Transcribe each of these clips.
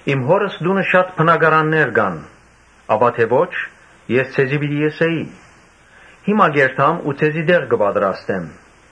Իմ Հօրս տունը շատ բնակարաններ կան. ապա թէ ոչ՝ ես ձեզի պիտի ըսէի՝ ‘Հիմա կ’երթամ, որ ձեզի տեղ պատրաստեմ’։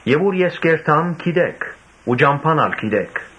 Ո՛ւր որ ես կ’երթամ՝ գիտէք ու ճամբան ալ գիտէք»։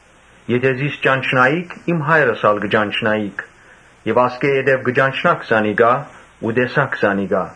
Եթէ զիս ճանչնայիք, իմ Հայրս ալ պիտի ճանչնայիք եւ ասկէ յետոյ պիտի ճանչնաք զանիկա ու տեսնէք զանիկա»։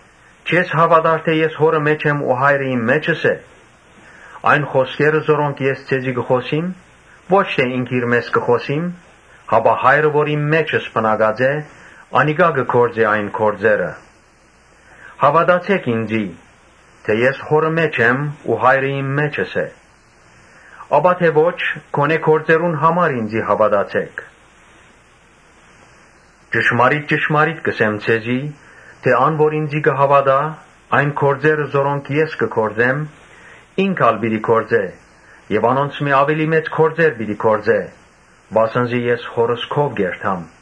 Չե՞ս հաւատար թէ ես Հօրը մէջն եմ ու Հայրը իմ մէջս է։ Այն խօսքերը որոնք ես ձեզի կը խօսիմ, ո՛չ թէ ինքնիրմէս կը խօսիմ, հապա Հայրը, որ իմ մէջս բնակած է, անիկա կը գործէ այս գործերը։ Հաւատացէ՛ք ինծի, թէ ես Հօրը մէջն եմ ու Հայրը իմ մէջս է. Ապա թէ ոչ՝ գոնէ գործերուն համար ինծի հաւատացէք։ Ճշմարիտ ճշմարիտ կ’ըսեմ ձեզի թէ՝ ‘Ան որ ինծի կը հաւատայ, այն գործերը որոնք ես կը գործեմ, ինք ալ պիտի գործէ եւ անոնցմէ աւելի մեծ գործեր պիտի գործէ’։ Վասն զի ես Հօրս քով կ’երթամ։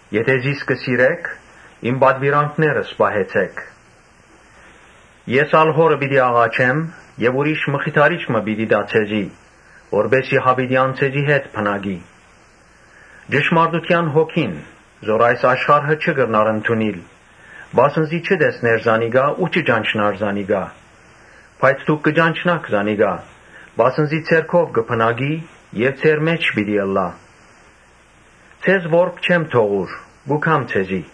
Եթէ զիս կը սիրէք, իմ պատուիրանքներս պահեցէ՛ք»։ «Ես ալ Հօրը պիտի աղաչեմ եւ ուրիշ մխիթարիչ մը պիտի տայ ձեզի, որպէս զի յաւիտեան ձեզի հետ բնակի. Ճշմարտութեան Հոգին, որ այս աշխարհը չի կրնար ընդունիլ, վասն զի չի տեսներ զանիկա ու չի ճանչնար զանիկա. բայց դուք կը ճանչնաք զանիկա, վասն զի ձեր քով կը բնակի եւ ձեր մէջ պիտի ըլլայ։ Ձեզ որբ չեմ թողուր, կու գամ ձեզի։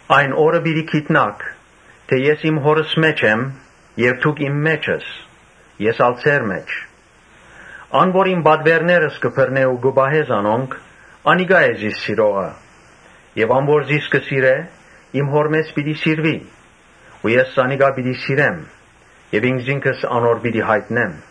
Այն օրը պիտի գիտնաք թէ ես իմ Հօրս մէջն եմ եւ դուք իմ մէջս, ես ալ ձեր մէջը։ Ան որ իմ պատուէրներս կը բռնէ ու կը պահէ զանոնք, անիկա է զիս սիրողը եւ ան որ զիս կը սիրէ՝ իմ Հօրմէս պիտի սիրուի ու ես զանիկա պիտի սիրեմ եւ ինքզինքս անոր պիտի յայտնեմ»։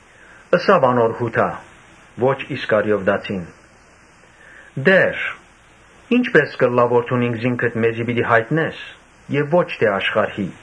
Ըսաւ անոր Յուդա (ոչ Իսկարիովտացին), «Տէ՛ր, ի՞նչպէս կ’ըլլայ որ դուն ինքզինքդ մեզի պիտի յայտնես եւ ո՛չ թէ աշխարհի»։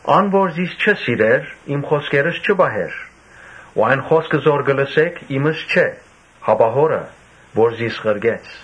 Ան որ զիս չի սիրեր, իմ խօսքերս չի պահեր։ Այն խօսքը որ կը լսէք՝ իմս չէ, հապա Հօրս՝ որ զիս ղրկեց։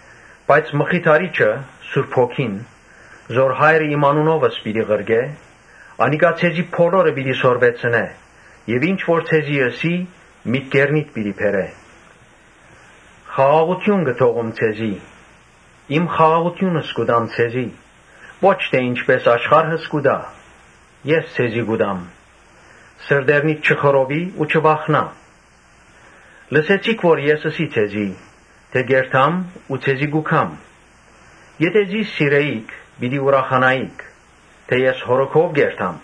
Բայց Մխիթարիչը՝ Սուրբ Հոգին՝ որ Հայրս իմ անունովս պիտի ղրկէ, անիկա ձեզի բոլորը պիտի սորվեցնէ եւ ինչ որ ձեզի ըսի՝ մտքերնիդ պիտի բերէ։ Խաղաղութիւն կը թողում ձեզի, ի՛մ խաղաղութիւնս կու տամ ձեզի, ո՛չ թէ ինչպէս աշխարհս կու տայ՝ ես ձեզի կու տամ։ Սրտերնիդ չխռովի ու չվախնայ։ Լսեցիք որ ես ըսի ձեզի թէ ‘Կ’երթամ ու ձեզի կու գամ’. եթէ զիս սիրէիք՝ պիտի ուրախանայիք, Ոմանք, որ ըսի թէոր ես Հօրը քով կ’երթամ,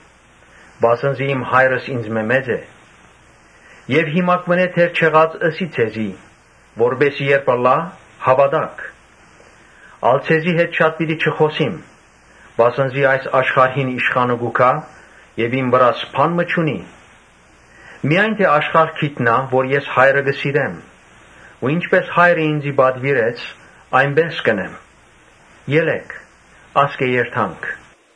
վասն զի իմ Հայրս ինծմէ մեծ է։ Եւ հիմա դեռ չեղած ըսի ձեզի, որպէս զի երբ ըլլայ՝ հաւատաք։ Ա՛լ ձեզի հետ շատ պիտի չխօսիմ, վասն զի այս աշխարհին իշխանը կու գայ եւ իմ վրաս բան մը չունի. Միայն թէ աշխարհ գիտնայ որ ես Հայրը կը սիրեմ ու ինչպէս Հայրը ինծի պատուիրեց, այնպէս կ’ընեմ։ Ելէ՛ք, ասկէ երթանք»։